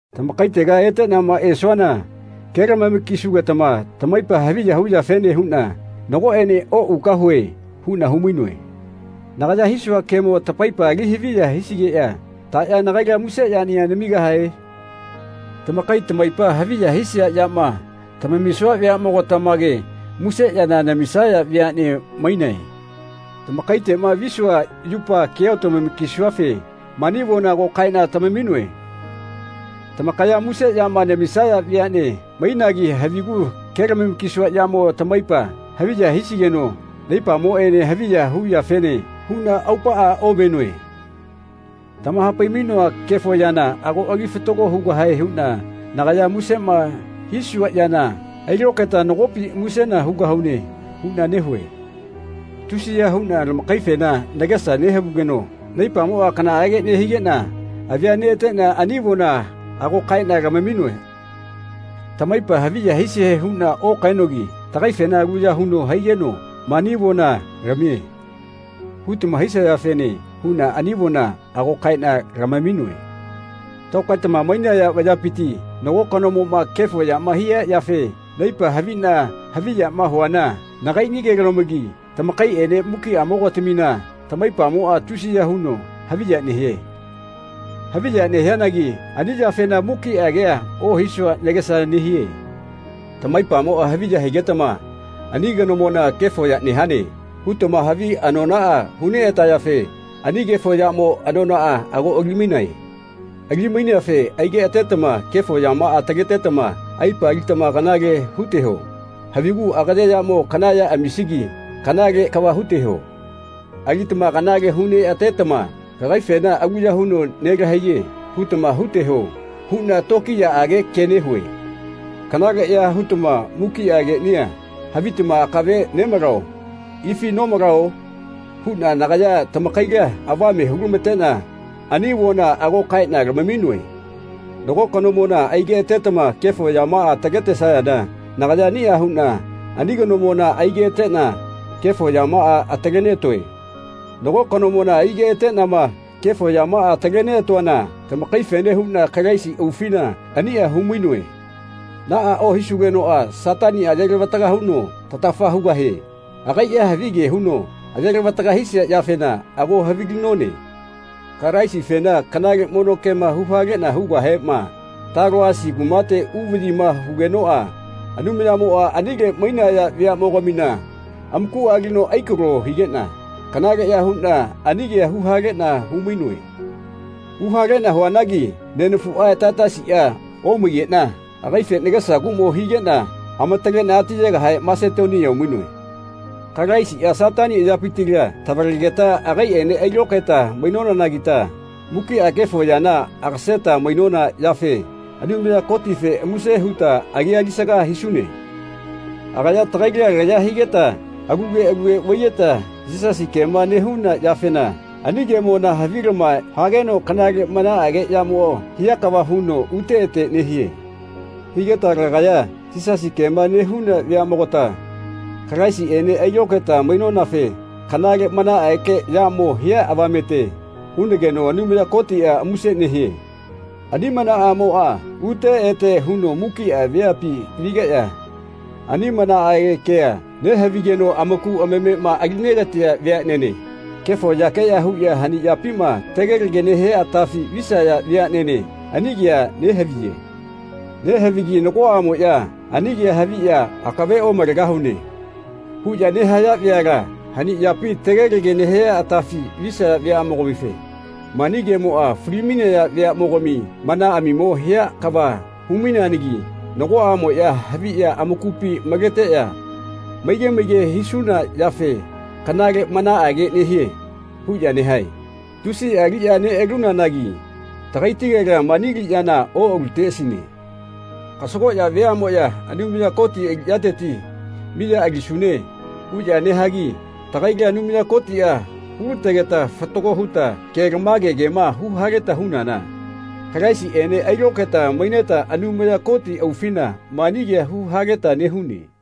Tamakaitega eteꞌnama esuana kelamama-kisugetama tamaipa haviya huyafene huꞌna nagoꞌene oꞌugahue huꞌna humainoe. Nagaya hisua kemo tamaipa ali haviya hisigeꞌya taꞌya nagaila muse yaniꞌa namigahae? Tamakai tamaipa haviya hisia yama tamamisua veaꞌmogatamage muse yana namisaya veaꞌnea mainae. Tamakaitegama visua yupa kea otamama-kisuafe mani avona ago kaeꞌna tamaminoe. Tamakaya muse yama namisaya veaꞌne mainagi havigu kelamama-kisua yamo tamaipa haviya hisigeno naipamoꞌene haviya hu yafene huꞌna aupaꞌa omenoe. Tamahapai-mainoa kefo yana ago ali fatago hugahae huꞌna nagaya musema hisua yana ailokaeta nagopi musena hugahune huꞌna nehue. Tusiya huꞌna tamakaifena nagesa nehavugeno naipamoꞌa kanaꞌage nehigeꞌna avi neꞌateꞌna ani avona ago kaeꞌna tamaminoe. Tamaipa haviya hisie huꞌna okaenogi “Tagaifena aluya huno haigeno mani avona lamie.” hutama hisayafene huꞌna ani avona ago kaeꞌna lamaminoe. Tokaetama mainaya vayapiti nago kanomoꞌma kefo yama hia yafe naipa haviꞌna haviyama huana nagaiꞌnigelomagi tamakaiꞌene mukiꞌamogatamina tamaipamoꞌa tusiya huno haviya nehie. Haviya nehianagi ani yafena mukiꞌa kea ohisua nagesa nehie. Tamaipamoꞌa haviya higetama ani kanomona “Kefo ya nehane.” hutama havi anonaꞌa hu neꞌatayafe ani kefo yamo anonaꞌa ago alimaine. Ali-maineafe aigeꞌatetama kefo yamaꞌa ataletetama aipa alitama kanale huteho. Havigu agaye yamo kana ya amisigi kanale kava huteho. Alitama kanale hu neꞌatetama “Kagaifena aluya huno nelahaiye.” hutama huteho huꞌna tokiyaꞌage ke nehue. “Kanaleꞌya hutama mukiꞌa keꞌnia havitama akave nemalao ifi nomalao?” huꞌna nagaya tamakaila avame hulamateꞌna ani avona ago kaeꞌna lamaminoe. Nago kanomona aigeꞌatetama kefo yamaꞌama ataletesayana nagaya aniꞌa huꞌna ani kanomona aigeꞌateꞌna kefo yamaꞌa ataleneꞌatoe. Nago kanomona aigeꞌateꞌnama kefo yamaꞌa ataletoana tamakaifene huꞌna Kalaisi aufina aniꞌa humainoe. Naꞌa ohisugenoꞌa Sataniꞌa ayelavataga huno tatafa hugahie. Agaiꞌa havige huno ayelavataga hisia yafena ago havilinone. Kalaisifena kanale mono kema huhaleꞌna hugahema Taloasi kumate uvaꞌyima hugenoꞌa Anumayamoꞌa anile mainaya veaꞌmogamina amakuꞌa alino aikalo higeꞌna kanaleꞌya huꞌna ani kea huhaleꞌna humainoe. Huhaleꞌna huanagi nenafuꞌa Taitasiꞌa omaigeꞌna agaife nagesa kuꞌmo higeꞌna amataleꞌna atiyegahe Masetonia umainoe. Kalaisiꞌa Satani ayapitila tavalegeta agaiꞌene ailokaeta mainonanagita mukiꞌa kefo yana agaseta mainona yafe Anumaya Kotife muse huta agia alisaga hisune. Agaya tagaila laya higeta alule alule vaiyeta Yisasi kema nehuna yafena ani kemona havilama hageno kanale manaꞌage yamo hia kava huno ute ete nehie. Higeta lagaya Yisasi kema nehuna veaꞌmogata Kalaisiꞌene ailokaeta mainonafe kanale manaꞌage yamo hia avamete hunageno Anumaya Kotiꞌa muse nehie. Ani manaꞌamoꞌa ute ete huno mukiꞌa veapi vigeꞌya ani manaꞌage kea nehavigeno amaku amamema alinegatia veaꞌnene kefo yakeꞌya huꞌya hani yapima tegelege nehia atafi visaya veaꞌnene ani kea nehaviye. Nehavigi nagoꞌamoꞌya ani kea haviꞌya “Akave omalegahune.” huꞌya nehaya veala hani yapi tegelege nehia atafi visaya veaꞌmogamife mani kemoꞌa fali-mai veaꞌmogami manaꞌamimo hia kava humaineanagi nagoꞌamoꞌya haviꞌya amakupi maleteꞌya “Maige maige hisuna yafe kanale manaꞌage nehie.” huꞌya nehae. Tusiꞌa aliꞌya neꞌalunanagi tagaitigela mani aliꞌyana oꞌaluteꞌasine. Kasagoꞌya veaꞌmoꞌya Anumaya Koti aliꞌyateti “Miya alisune.” huꞌya nehagi tagaila Anumaya Kotiꞌa hulategeta fatago huta kelamagema huhaleta hunana Kalaisiꞌene ailokaeta maineta Anumaya Koti aufina mani kea huhaleta nehune.